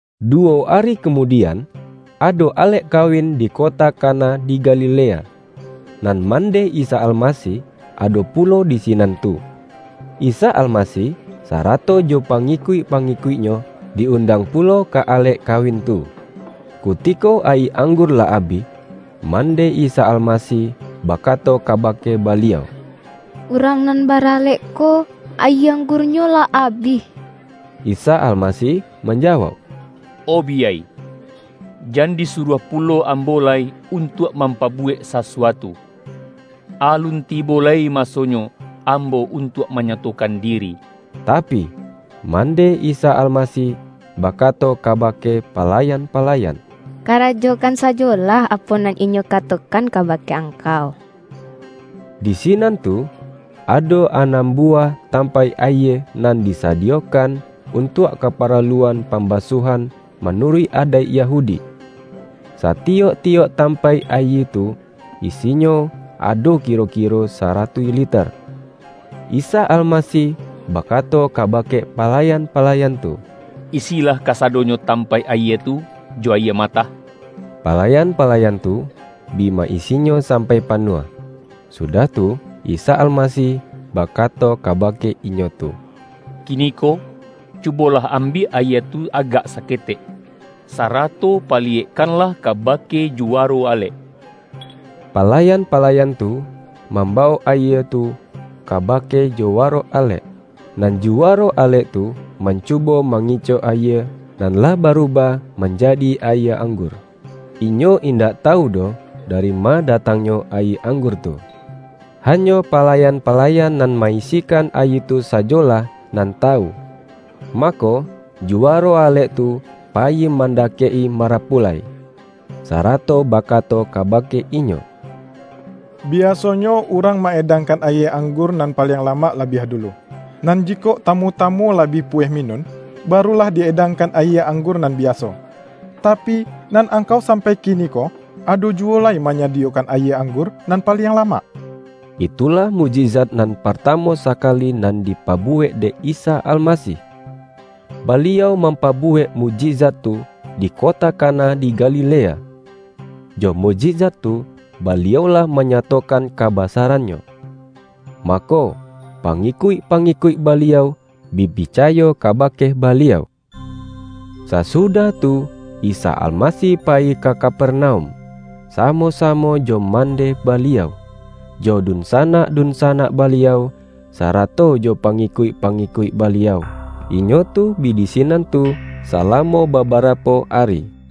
Duwo ari kamudian, ado alek kawin di kota Kana di Galilea, nan mandeh Isa Almasih ado pulo di sinan tu. Isa Almasih sarato jo Pangi-kuik-pangikuik-Nyo, di-undang pulo ka alek kawin tu. Kutiko ayie anggur lah abih, mandeh Isa Almasih baka-to kabake Baliau,”Urang nan baralek ko, ayie anggurnyo lah abih.” Isa Almasih manjawauk,”O biyai, jan disuruah pulo Ambo lai untuak mampabuwek sasuatu. Alun tibo lai masonyo Ambo untuak manyatokan diri.” Tapi, mandeh Isa Almasih bakato kabake palayan-palayan,”Karajokan sajolah apo nan Inyo katokan kaba-ke angkau.” Di sinan tu ado anam buwah tam-paik ayie, nan disadiyokan untuak kaparaluan pambasuahan manuruik adaik Yahudi. Satiyok-tiyok tampaik ayie tu, isinyo ado kiro-kiro saratuih liter. Isa Almasih bakato kabake pala-yan-palayan tu,”Isilah kasadonyo tam-paik ayie tu jo ayie matah.” Palayan-pa-layan tu bi ma-isinyo sampai panuah. Sudah tu, Isa Almasih bakato kabake inyo tu”Kiniko, cubolah ambiak ayie tu agak saketek, sarato paliyekkanlah kabake juwaro alek.” Palayan-pala-yan tu mambawok ayie tu kabake ju-waro alek, nan juwaro alek tu man-cubo mangicok ayie nan lah barubah manjadi ayie anggur. Inyo indak tawu doh dari ma datangnyo ayie anggur tu, hanyo palayan-palayan nan ma-isikan ayie tu sajolah nan tawu. Mako, juwa-ro alek tu payi mandakek-i marapulai, sarato bakato kabake inyo,”Biaso-nyo, urang ma-edangkan ayie anggur nan paliang lamak labiah dulu, nan ji-kok tamu-tamu lah bi puweh minun, barulah di-edangkan ayie anggur nan biaso. Tapi, nan angkau sampai kini-ko, ado juwo lai manyadiyokan ayie anggur nan paliang lamak!” Itulah mukjizat nan partamu sa-kali nan dipabuwek dek Isa Almasih. Baliau mampabuwek mukjizat tu di kota Kana di Galilea. Jo mukjizat tu, Baliau lah manyatokan kabasaran-Nyo. Mako, pangikuik-pangikuik Ba-liau bi picayo kabake Baliau. Sasudah tu Isa Almasih payi ka Kapernaum, samo-samo jo mandeh Baliau, jo dunsanak-dunsanak Baliau, sarato jo pangikuik-pangikuik Baliau. Inyo tu bi di sinan tu salamo baba-rapo ari.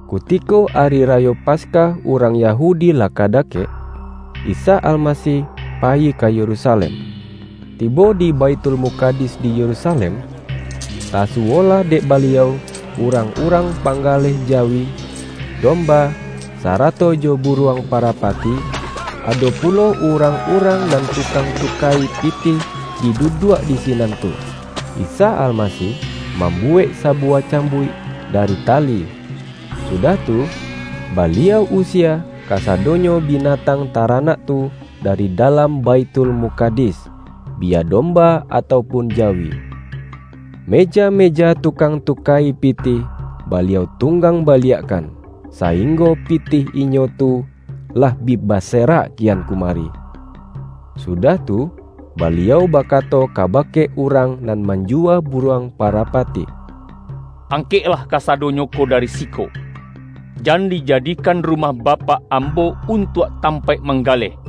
Kutiko Ari Rayo Paskah urang Ya-hudi lah ka dakek, Isa Almasih payi ka Yerusalem. Tibo di Baithulmukadis di Yerusalem, tasuwolah dek Baliau urang-urang panggaleh jawi, domba, sarato jo buruang parapati, ado pulo urang-urang nan tukang tuka-i pitih bi duduak di sinan tu. Isa Almasih mambuwek sabuwah cambuik dari ta-li, sudah tu, Baliau usie kasadonyo bi-natang taranak tu dari dalam Baithul-mukadis, biya domba atau pun jawi. Meja-meja tukang tuka-i pitih, Baliau tunggang baliakkan, sainggo pitih inyo tu lah bi baserak kian kumari. Sudah tu, Baliau bakato kabake urang nan manjuwa buruang parapati,”Angkek-lah kasadonyo ko dari siko. Jan dija-dikan Rumah Bapak Ambo untuak tampaik manggaleh!”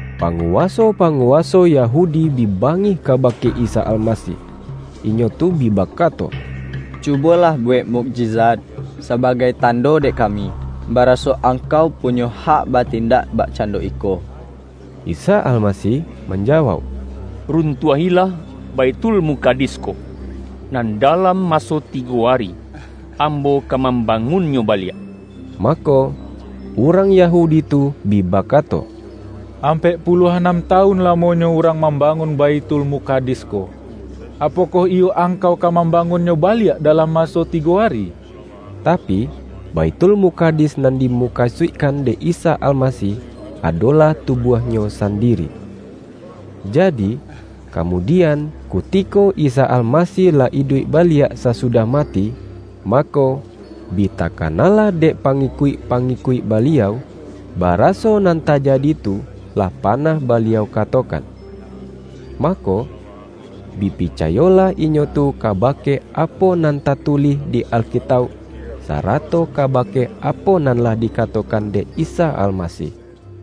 Panguwaso-panguwaso Yahudi bi bangih kabake Isa Almasih, inyo tu bi bakato,”Cubolah buwek mukjizat, sa-bagai tando dek kami, baraso Angkau punyo hak batindak bakcando iko.” Isa Almasih manjawauk,”Run-tuahilah Baithulmukadis ko, nan dalam maso tigo ari, Ambo ka mamba-ngunnyo baliak.” Mako, urang Yahudi tu bi baka-to,”Ampek puluah anam tawun la-monyo urang mambangun Baithul-mukadis ko. Apokoh iyo Angkau ka mambangunnyo baliak dalam maso tigo ari?” Tapi, Baithulmukadis nan dimu-kasuikkan dek Isa Almasih, adolah tubuah-Nyo sandiri. Jadi, kamudi-an, kutiko Isa Almasih lah iduik ba-liak sasudah mati, mako, bi takana-lah dek pangikuik-pangikuik Baliau, baraso nan tajadi tu, lah panah Baliau katokan. Mako, bi picayolah inyo tu kabake apo nan tatulih di Alkitauk, sarato kabake apo nan lah dikatokan dek Isa Almasih.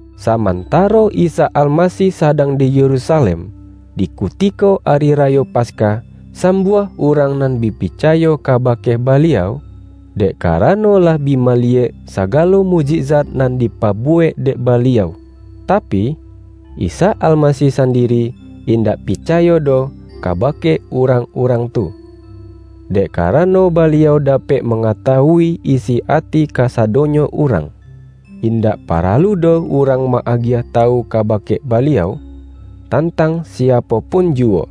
Samantaro Isa Almasih sadang di Yerusalem, di kutiko Ari Rayo Pas-kah, sambuah urang nan bi picayo kabake Baliau, dek karano lah bi ma-liyek sagalo mukjizat nan dipabuwek dek Baliau. Tapi, Isa Almasih san-diri indak picayo doh kabake urang-urang tu, dek karano Baliau dapek mangatawui isi ati kasadonyo urang. Indak paralu doh urang ma-agiah tawu kabake Baliau, tantang siapo pun juwo,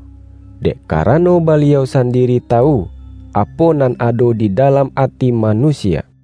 dek karano Baliau sandi-ri tawu, apo nan ado di dalam ati manusia. YAHYA